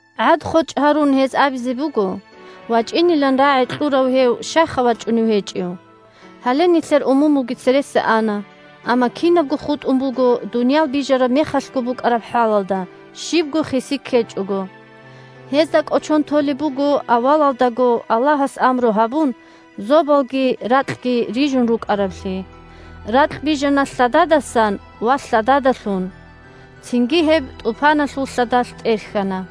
ГӀад-хочӀ гьарун, гьез абизе буго: «ВачӀинилан рагӀи кьурав гьев щайха вачӀунев гьечӀев? Гьале нилъер умумулги цереса ана, амма кинабго хутӀун буго дуниял бижараб мехалъго букӀараб хӀалалда, щибго хиси ккечӀого». Гьезда кӀочон толеб буго авалалдаго, Аллагьас амру гьабун, зобалги ракьги рижун рукӀараблъи. Ракь бижана лъададасан ва лъададалъун. Цинги гьеб тӀупаналъул лъадалъ тӀерхьана.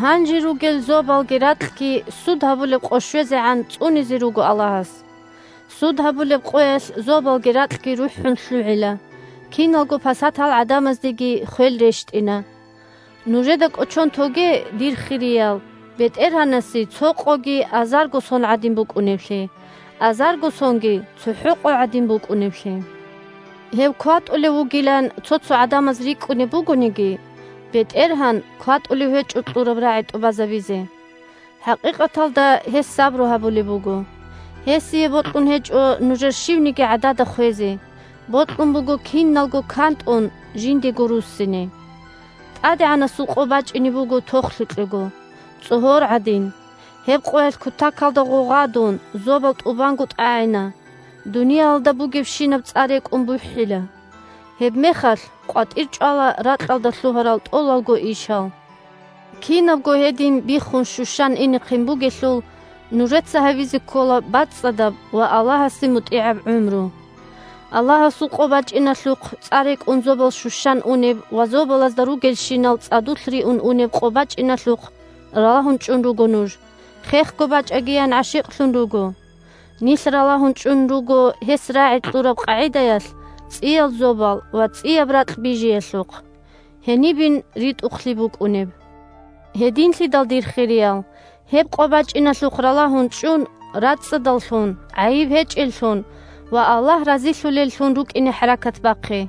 Гьанже ругел зобалги ракьги Суд гьабулеб къо щвезегӀан цӀунизе руго Аллагьас. Суд гьабулеб къоялъ зобалги ракьги рухӀун лъугӀила, киналго пасатал гӀадамаздеги хвел рещтӀина. Нужеда кӀочон тоге, дир хириял, БетӀергьанасе цо къоги азарго сон гӀадин букӀунеблъи, азарго сонги цохӀо къо гӀадин букӀунеблъи. Гьев кватӀулев вугилан цо-цо гӀадамаз рикӀкӀунеб бугониги, БетӀергьан кватӀулев гьечӀо кьураб рагӀи тӀубазабизе. ХӀакъикъаталда гьес сабру гьабулеб буго: гьесие бокьун гьечӀо нужер щивниги гӀадада хвезе – бокьун буго киналго кантӀун жиндего руссине. ТӀадегӀанасул Къо бачӀине буго тохлъукьего, цӀогьор гӀадин. Гьеб Къоялъ, кутакалда гъугъадун, зобал тӀубанго тӀагӀина, дуниялалда бугебщинаб цӀа рекӀун бухӀила. Гьебмехалъ къватӀирчӀвала ракьалда лъугьарал тӀолалго ишал. Кинабго гьедин биххун-щущан инехъин бугелъул, нужеца гьабизе ккола бацӀцӀадаб ва Аллагьасде мутӀигӀаб гӀумру. Аллагьасул Къо бачӀиналъухъ – цӀа рекӀун зобал щущан унеб ва зобалазда ругелщинал цӀадулъ риун унеб къо бачӀиналъухъ – ралагьун чӀун руго нуж, хехго бачӀагиян гӀашикълъун руго! Нилъ ралагьун чӀун руго, гьес рагӀи кьураб къагӀидаялъ, цӀиял зобал ва цӀияб ракь бижиялъухъ. Гьенибин ритӀухълъи букӀунеб! Гьединлъидал, дир хириял, гьеб къо бачӀиналъухъ ралагьун чӀун, рацӀцӀадаллъун, гӀайиб гьечӀеллъун ва Аллагь разилъулеллъун рукӀине хӀаракат бахъе.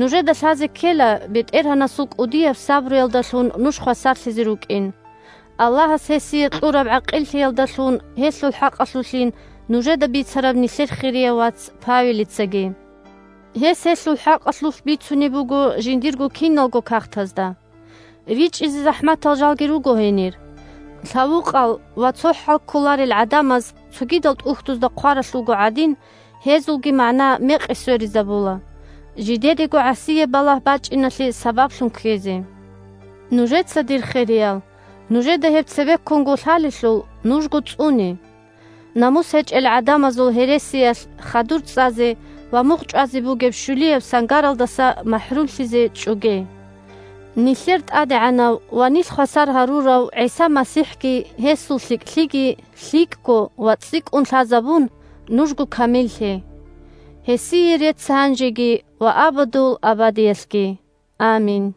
Нужеда лъазе ккела БетӀергьанасул кӀудияб сабруялдалъун нуж хвасарлъизе рукӀин. Аллагьас гьесие кьураб гӀакъиллъиялдалъун гьелъул хӀакъалъулъин нужеда бицараб нилъер хирияв вац Павелицаги. Гьес гьелъул хӀакъалъулъ бицунеб буго жиндирго киналго кагътазда. РичӀчӀизе захӀматал жалги руго гьенир, лъавукъал ва цо хӀал кколарел гӀадамаз, цогидал тӀухьдузда хъваралъулго гӀадин, гьезулги магӀна мекъи сверизабула, – жидедего гӀасияб балагь бачӀиналъе сабаблъун ккезе. Нужеца, дир хириял, нужеда гьеб цебеккунго лъалелъул, нужго цӀуне! Намус гьечӀел гӀадамазул гьересиялъ хадур цӀазе ва мугъчӀвазе бугеб щулияб сангаралдаса махӀрумлъизе чӀоге! Нилъер ТӀадегӀанав ва нилъ хвасар гьарурав ГӀиса МасихӀги гьесул лъикӀлъиги лъикӀго ва цӀикӀкӀун лъазабун, нужго камиллъе. Гьесие рецц гьанжеги ва абадул абадиялъги. Амин.